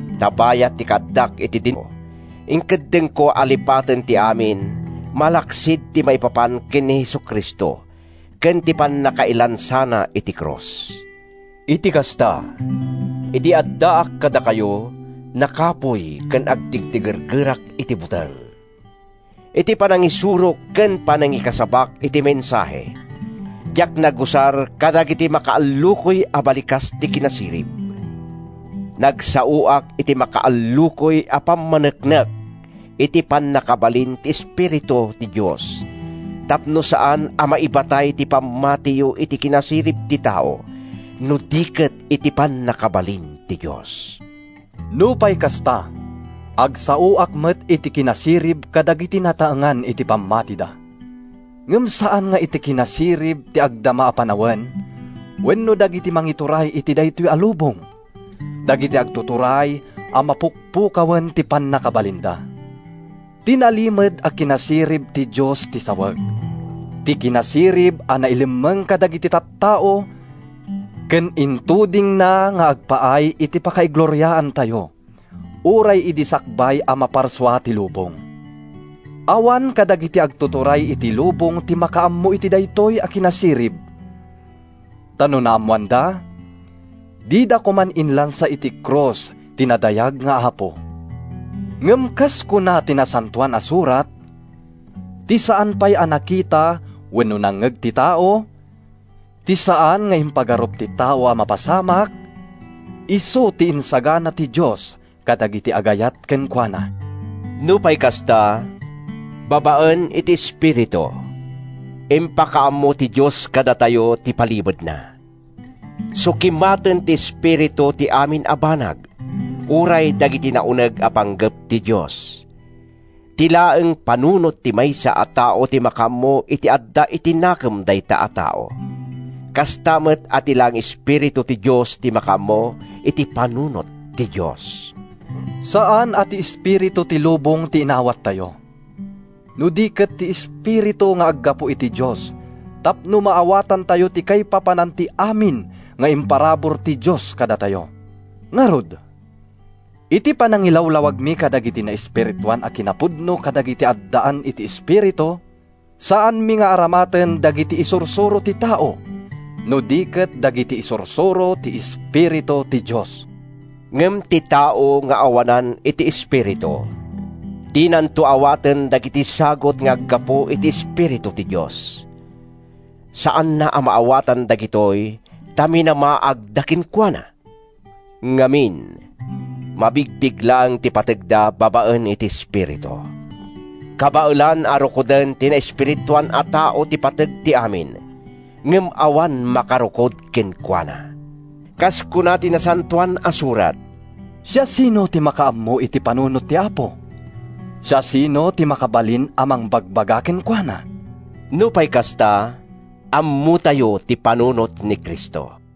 Ta bayat ti kaaddak iti dennayo, inkeddengko a lipaten ti amin malaksid ti maipapan ken ni Jesu-Cristo ken ti pannakailansana iti krus. Iti kasta, idi addaak kadakayo, nakapuy ken agtigtigergerak iti buteng. Iti panangisurok ken panangikasabak iti mensahe, diak nagusar kadagiti makaallukoy a balikas ti kinasirib. Nagsaoak iti makaallukoy a pammaneknek iti pannakabalin ti Espiritu ti Dios, tapno saan a maibatay ti pammatiyo iti kinasirib ti tao, no di ket iti pannakabalin ti Dios. Nupay kasta, agsaoak met iti kinasirib kadagiti nataengan iti pammatida. Ngem saan nga iti kinasirib ti agdama a panawen wenno dagiti mangituray iti daytoy a lubong—dagiti agtuturay a mapukpukawen ti pannakabalinda. Ti nalimed a kinasirib ti Dios ti sawek, ti kinasirib a nailemmeng kadagiti tattao ken intudingna nga agpaay iti pakaigloriaantayo, uray idi sakbay a maparsua ti lubong. Awan kadagiti agtuturay iti lubong ti makaammo iti daytoy a kinasirib. Ta no naammoanda, dida koman inlansa iti krus ti nadayag nga Apo. Ngem kas kuna ti Nasantoan a Surat, “Ti saan pay a nakita wenno nangngeg ti tao, ti saan nga impagarup ti tao a mapasamak, isu ti insagana ti Dios kadagiti agayat kenkuana.” Nupay kasta, babaen iti Espiritu, impakaammo ti Dios kadatayo ti palimedna. Sukimaten ti Espiritu ti amin a banag, uray dagiti nauneg a panggep ti Dios. Ti laeng panunot ti maysa a tao ti makaammo iti adda iti nakem dayta a tao, kasta met a ti laeng Espiritu ti Dios ti makaammo iti panunot ti Dios. Saan a ti espiritu ti lubong ti inawattayo, no di ket ti Espiritu nga aggapu iti Dios tapno maawatantayo ti kaipapanan ti amin nga imparabur ti Dios kadatayo. Ngarud, iti panangilawlawagmi kadagiti naespirituan a kinapudno kadagiti addaan iti Espiritu, saanmi nga aramaten dagiti isursuro ti tao, no di ket dagiti isursuro ti Espiritu ti Dios. Ngem ti tao nga awanan iti Espiritu, dinanto awaten dagiti sagut nga aggapu iti Espiritu ti Dios. Saanna a maawatan dagitoy ta minamaagda kenkuana. Ngamin, mabigbig laeng ti pategda babaen iti espiritu. Kabaelan a rukoden ti naespirituan a tao ti pateg ti amin, ngem awan makarukod kenkuana. Kas kuna ti Nasantoan a Surat, “Siasino ti makaammo iti panunot ti Apo? Siasino ti makabalin a mangbagbaga kenkuana?” Nupay kasta, ammotayo ti panunot ni Cristo.